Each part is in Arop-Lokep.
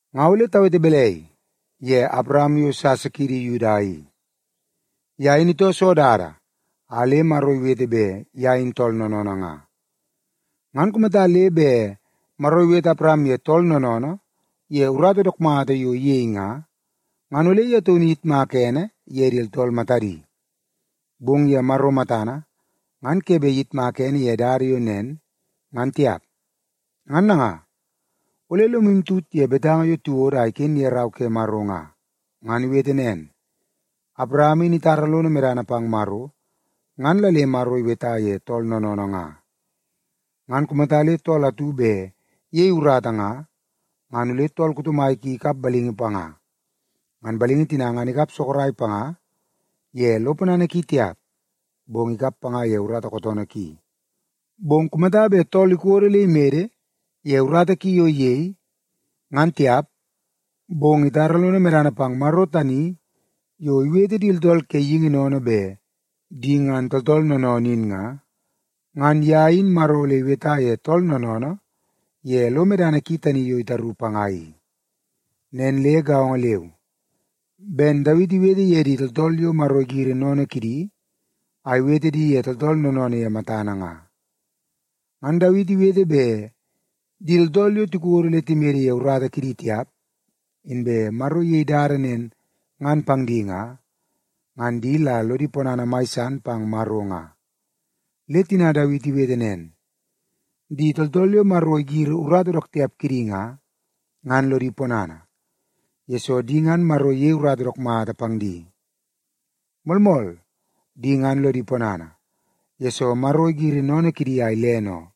Nga ole tawete balai ye Awaram yo sasa kiidi Yuda i? Ye in itoo soo dada a le Maro iweta bet ye in tool noonoonoo nga? Ngan kumata le bet Maro iwete Awaram ye tool noonoonoo ye urata dook mata yo iyei nga, ngan ole ye taunu iyitmaka ene ye di tooltool matadi. Bong ye Maro matana, ngan ke bet iyitmak ene ye dada yo nen, ngan tiap. Ngan nanga, ole lomu tut ye betanga yo tiwodo a iken ye Rau ke Maro nga. Ngan iwete nen, “Awaram in itara lono medana pang Maro, ngan la le Maro iweta ye tool noonoonoo nga.” Ngan kumata le tool atu bet iyei urata nga, ngan ole tool kuto mai ki ikap balingi panga. Ngan balingi tina ngan ikap sorok panga ye lo ponana ki tiap, bong ikap panga ye urata kootoonoo ki. Bong kumata bet tool ikodo le imede ye urata ki yo iyei, ngan tiap, bong itara lono medana pang Maro tani yo iwete di tooltool ke geingi sennene bet di ngan tooltool noonoonoo in nga, ngan ye in Maro ole iweta ye tool noonoonoo ye lo medana ki tani yo itaru panga i. Nen le gaongo leu ben Dawiti iwete ye di tooltool yo Maro igiri sennene kidi a iwete di ye tooltool noonoonoo ye matana nga. Ngan Dawiti iwete bet di tooltool yo tikodo le timede ye urata kidi tiap, inbe Maro iyei dada nen ngan pang di nga, ngan di la lodi ponana mai san pang Maro nga. Le tina Dawiti iwete nen, “Di tooltool yo Maro igiri urata dook tiap kidi nga, ngan lodi ponana, yesoo di ngan Maro iyei urata dook mata pang di. Moolmool, di ngan lodi ponana, yesoo Maro igiri sennene kidi a ilene oo.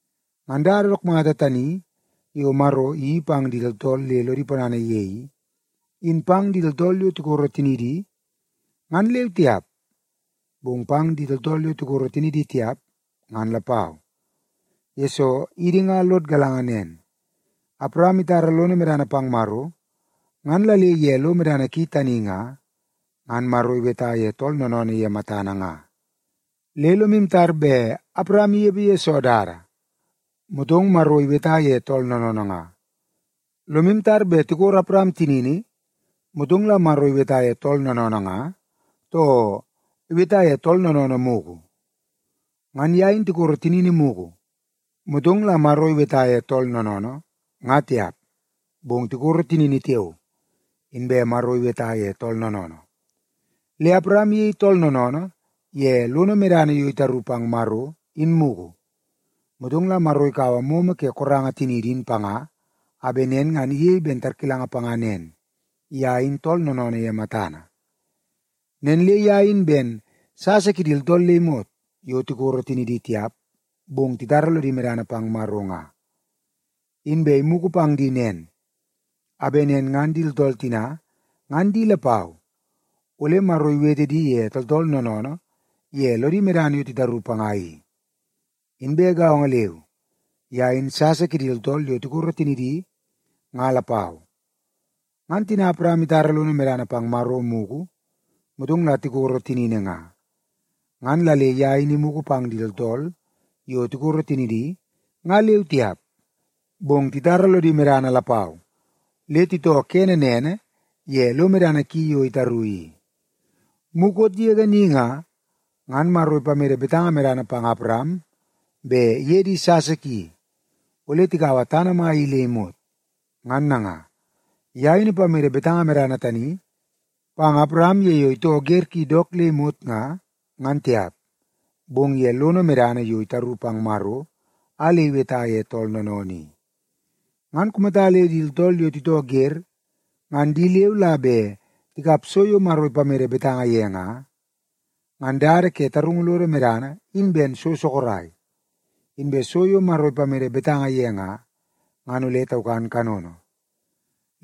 Ngan dada dook mata tani yo Maro iyeii pang di tooltool le lodi ponana ye i, in pang di tooltool yo tikoro tinidi, ngan leu tiap, bong pang di tooltool yo tikoro tinidi tiap, ngan lapau. Yesoo, idi nga lod galanga nen, Awaram itara lono medana pang Maro, ngan la le ye lo medana ki tani nga, ngan Maro iweta ye tool noonoonoo ye matana nga. Le lomu tar bet Awaram inepe ye soo dada, motong Maro iweta ye tool noonoonoo nga? Lomu tar bet tikoro Awaram tinini, motong la Maro iweta ye tool noonoonoo nga, too iweta ye tool noonoonoo mugu? Ngan ye in tikoro tinini mugu, motong la Maro iweta ye tool noonoonoo, nga tiap, bong tikoro tinini tiao, inbe Maro iweta ye tool noonoonoo. Le Awaram iyei tool noonoonoo ye lono medana yo itaru pang Maro, in mugu, motong la Maro ikaua momo ke koranga tiniidi in panga, a bet nen ngan iyei ben tarkilanga panga nen; ye in tool noonoonoo ye matana. Nen le ye in ben sasa kidi tooltool le imot yo tikoro tinidi tiap, bong titara lodi medana pang Maro nga. Inbe imugu pang di nen, a bet nen ngan di tooltool tina ngan di lapau ole Maro iwete di ye tooltool noonoonoo ye lodi medana yo titaru panga i. Inbe gaongo leu, ye in sasa kidi tooltool yo tikoro tinidi nga lapau. Ngan tina Awaram itara lono medana pang Maro mugu, motong la tikoro tinini nga, ngan la le ye in imugu pang di tooltool yo tikoro tinidi nga leu tiap, bong titara lodi medana lapau le titoo kene nene ye lo medana ki yo itaru i. Mukot yege ni nga, ngan Maro ipamede betanga medana pang Awaram bet iye di sasa ki ole tikaua tana mai i le imot. Ngan nanga, ye in ipamede betanga medana tani pang Awaram ye yo itoo wer ki dook le imot nga, ngan tiap, bong ye lono medana yo itaru pang Maro a le iweta ye tool noonoonoo i. Ngan kumata le di tooltool yo titoo wer ngan di leu la bet tikap so yo Maro ipamede betanga ye nga, ngan dada ke tarungu lodo medana in ben so sorok, inbe so yo Maro ipamede betanga ye nga, ngan ole taukan kanono.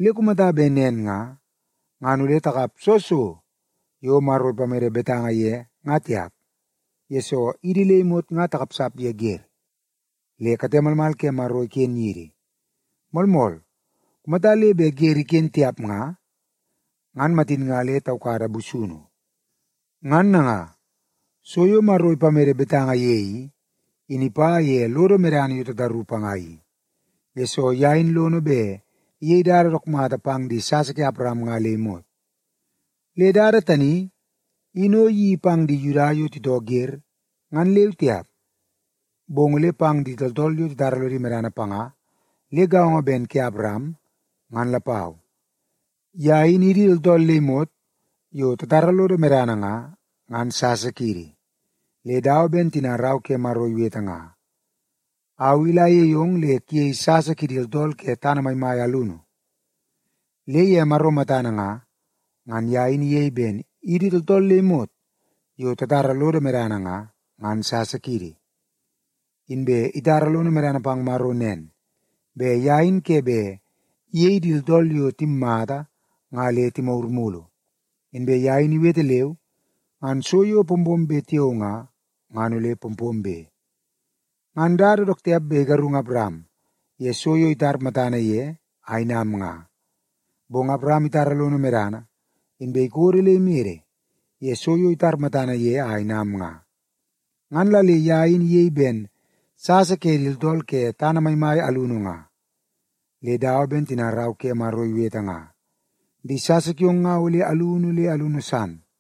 Le kumata bet nen nga, ngan ole takap soo so yo Maro ipamede betanga ye nga tiap, yesoo idi le imot nga takapsap ye wer, le kate malmal ke Maro iken yidi. Moolmool, kumata le bet wer iken tiap nga, ngan matin nga le taukada busunu. Ngan nanga, so yo Maro ipamede betanga ye i, in ipa ye lodo medana yo tataru panga i, yesoo ye in lono bet iyei dada dook mata pang di sasa ke Awaram nga le imot. Le dada tani in o iyeii pang di Yuda yo titoo wer ngan leu tiap, bong ole pang di tooltool yo titara lodi medana panga le gaongo ben ke Awaram, ngan lapau. Ye in idi tooltool le imot yo tatara lodo medana nga, ngan sasa kiidi. Le dawa ben tina Rau ke Maro iwete nga, “Au i ole ayei ong le kuyei sasa kidi tooltool ke tana maimai alunu.” Le ye Maro matana nga, ngan ye in iyei ben idi tooltool le imot yo tatara lodo medana nga, ngan sasa kiidi. Inbe itara lono medana pang Maro nen; bet ye in ke bet iyei di tooltool yo timmata nga le timagur mulu, inbe ye in iwete leu, ngan so yo pompombe tiao nga, ngan ole pompombe. Ngan dada dook tiap bet igarungu Awaram ye so yo itar matana ye a inam nga. Bong Awaram itara lono medana, inbe ikodo le imede ye so yo itar matana ye a inam nga, ngan la le ye in iyei ben sasa ke di tooltool ke tana maimai alunu nga. Le dawa ben tina Rau ke Maro iwete nga, “Di sasa kiong nga ole alunu le alunu san.”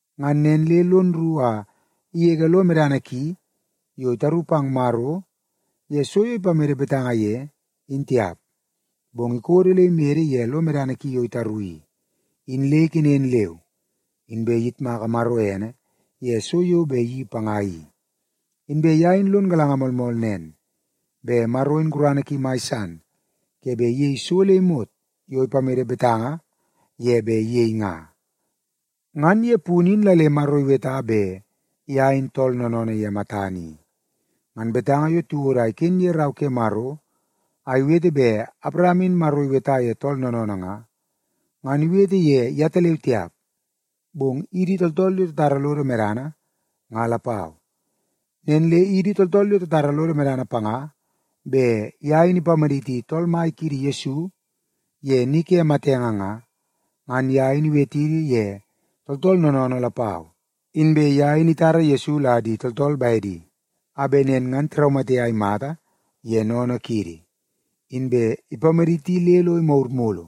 Ngan nen le lon rru a igege lo medana ki yo itaru pang Maro ye so yo ipamede betanga ye, in tiap. Bong ikodo le imede ye lo medana ki yo itaru i, in le ikenen leu, inbe iyitmaka Maro ene ye so yo bet iyeii panga i. Inbe ye in lon galanga moolmool nen, bet Maro in gurana ki mai san ke bet iyei so le imot yo ipamede betanga ye bet iyei nga. Ngan ye punu in la le Maro iweta bet ye in tool noonoonoo ye matana i. Ngan betanga yo tiwodo a iken ye Rau ke Maro a iwete bet Awaram in Maro iweta ye tool noonoonoo nga, ngan iwete ye yetaleu tiap, bong idi tooltool yo tatara lodo medana nga lapau. Nen le idi tooltool yo tatara lodo medana panga bet ye in ipamaditi Tool Mai kiidi Yesu ye ni ke matenge nga, ngan ye in iwetidi ye tooltool noonoonoo lapau. Inbe ye in itara Yesu la di tooltool bedi a bet nen ngan tiraumate a imata ye sennene kiidi. Inbe ipamaditi le lo imagur mulu,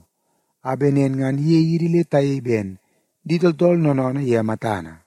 a bet nen ngan iyei idi le tayei ben di tooltool noonoonoo ye matana.